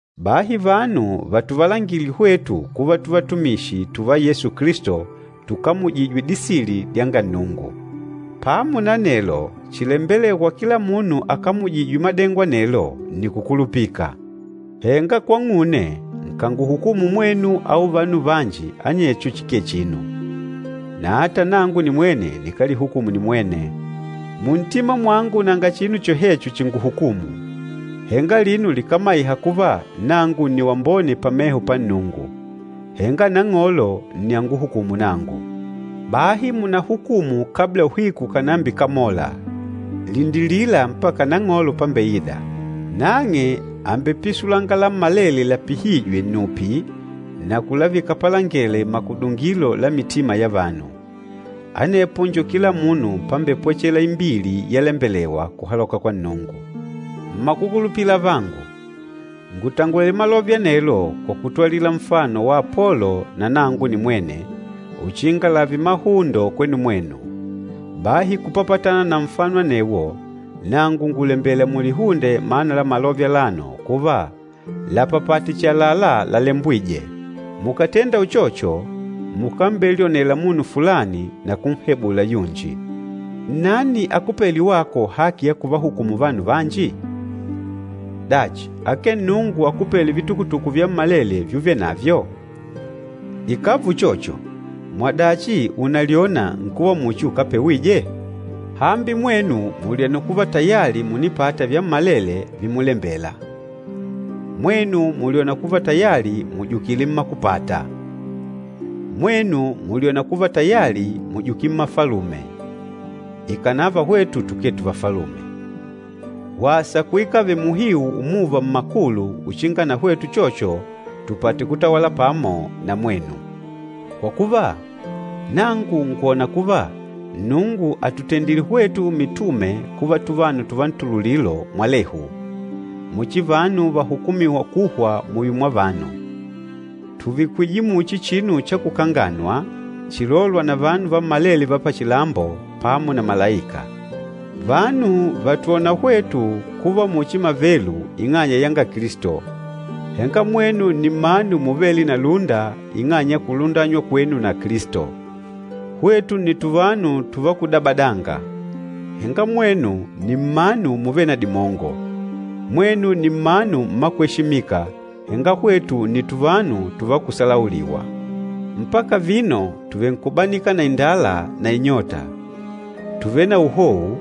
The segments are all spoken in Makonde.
Bahi vanu vatuvalangile hwetu kuva tuvatumishi tùva Yesu Kilisto, tukamujîjwe disili dyanga Nnungu. Pamo na anelo, chilembelêwa kwa kila munu akamujîjwe madengo anelo nni kukulupika. Henga kwang'une, nkànguhukumu mwenu au vanu vanji anecho chikee chinu, na ata nangu nimwene nikálihukumu nimwene. Muntima mwangu nanga chinu chohecho chinguhukûmu, henga alino likámaiha kuva nangu nni wambone pameho pa Nnungu. Henga Nang'olo nni anguhukûmu nangu. Bahi munáhukumu kabla uhiku ukànambikamola, lindilila mpaka Nang'olo pambeida. Nang'e àmbepisulanga lammalele lapihîjwe nnupi na kulavika palangele makudungilo la mitima ya vanu. Anepo njo kila munu pambepwechelela imbili yalembelewa kuhaloka kwa Nnungu. Mmakukulupila avangu, ngùtangwele malove anelo kwa kutwalila nfano wa Apolo na nangu nimwene, uchinga lààve mahundo kwenu mwenu. Bahi kupapatana na nfano anewo nangu ngùlembela mulihunde mana la malove alano kuva, “Lapapate chihi àlalá lalembwîje.” Mukàtenda uchocho mukambelyonela munu fulani na kunhebula yunji. Nnani akupêle wako haki ya kuvahukumu vanu vanji? Dachi, akee Nnungu akupêle vitukutuku vyammalele vyuvenavyo? Ikàva uchocho, mwadachi unalyôna nkuva muchi ukápewije? Hambi mwenu mùlyona kuva tayali mùnipata vyammalele vimulembela! Mwenu mùlyona kuva tayali mùjukile mmakupata! Mwenu mùlyona kuva tayali mùjukile mmafalume, ikànava hwetu tukee tuvafalume! Wasa kuikave muhiu umuva mmakulu uchinga na hwetu uchocho tupate kutawala pamo na mwenu! Kwa kuva, nangu ngwòna kuva Nnungu àtutendile hwetu mitume kuva tuvanu tuvantululilo mwalehu, muchi vanu vahukumîwa kuhwa muyo mwa vanu. Tùvikwije muchi chinu cha kukanganwa, chilôlwa na vanu vammalele va pachilambo pamo na malaika. Vanu vàtwona hwetu kuva muchi mavelu ing'anya yanga Kilisto, henga mwenu nni mmanu muvêle na lúnda ing'anya ya kulundanywa kwenu na Kilisto! Hwetu nni tuvanu tùvá kudabadanga, henga mwenu nni mmanu muvêle na dimongo. Mwenu nni mmanu mmakweshimika, henga hwetu nni tuvanu tùvá kuhebuliwa! Mpaka vino, tùvenkubanika na indala na inyota, tùvele na uhou,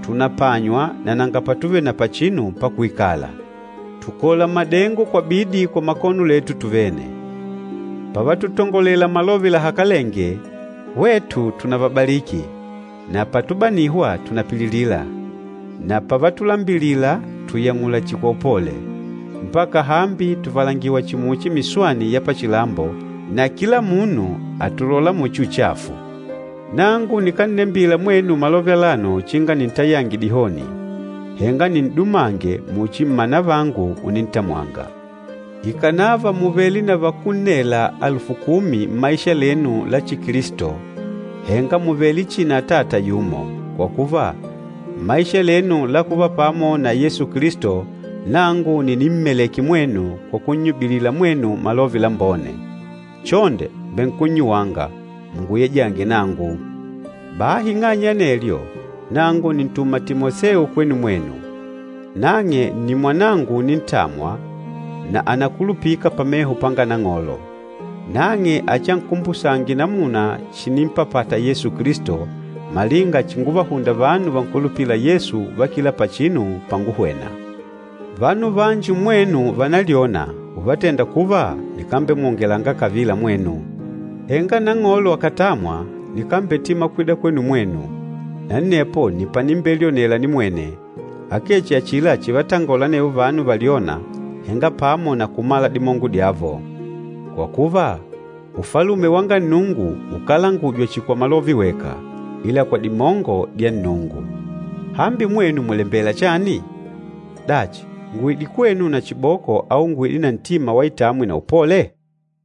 tùnapanywa na nanga patuvele na pachinu pakuikala. Tùkola madengo kwa bidi kwa makono letu tuvene. Pavatutangolela malove lahakalenge, hwetu tùnavabaliki na patubanihwa tùnapililila, na pavatulambilila tùyang'ula chihi kwa upole. Mpaka hambi tùvalangiwá chihi muchi miswani ya pachilambo na kila munu àtulola muchi uchafu. Nangu nikánnembila mwenu malove alano uchinga nintayange dihoni, henga nin'dumange muchi mmanavangu unintamwanga. Ikànava mùvele na vakunnela alufu kumi mmaisha lenu la Chikilisto, henga mùvele chihi na atata yumo. Kwa kuva, mmaisha lenu la kuva pamo na Yesu Kilisto nangu nni nimmalêke mwenu kwa kunnyubilila mwenu Malove Lambone. Chonde, mbènkunyuwanga, munguyejange nangu. Bahi ing'anya ya anelyo, nangu nìntuma Timoseo kwenu mwenu. Nang'e nni mwanangu unintamwa na ànakulupika pameho panga Nang'olo. Nang'e achiankumbusange namuna chinimpapata Yesu Kilisto, malinga chinguvahunda vanu vankulupîla Yesu va kila pachinu panguhwena. Vanu vanji mmwenu vànalyona, uvatenda kuva nikámbemwongela kavila mwenu. Henga Nang'olo akàtamwa, nikambetima kwida kwenu mwenu, na anepo nni panimbelyonela nimwene, akee chihi achila chivatangola anevo vanu valyôna, henga pamo na kumala dimongo dyavo. Kwa kuva, Ufalume wanga Nnungu ukálangujwa chihi kwa malove weka, ila kwa dimongo dya Nnungu. Hambi mwenu mùlembela chani? Dachi, nguide kwenu na chiboko au nguide na ntima wa itamwi na upole?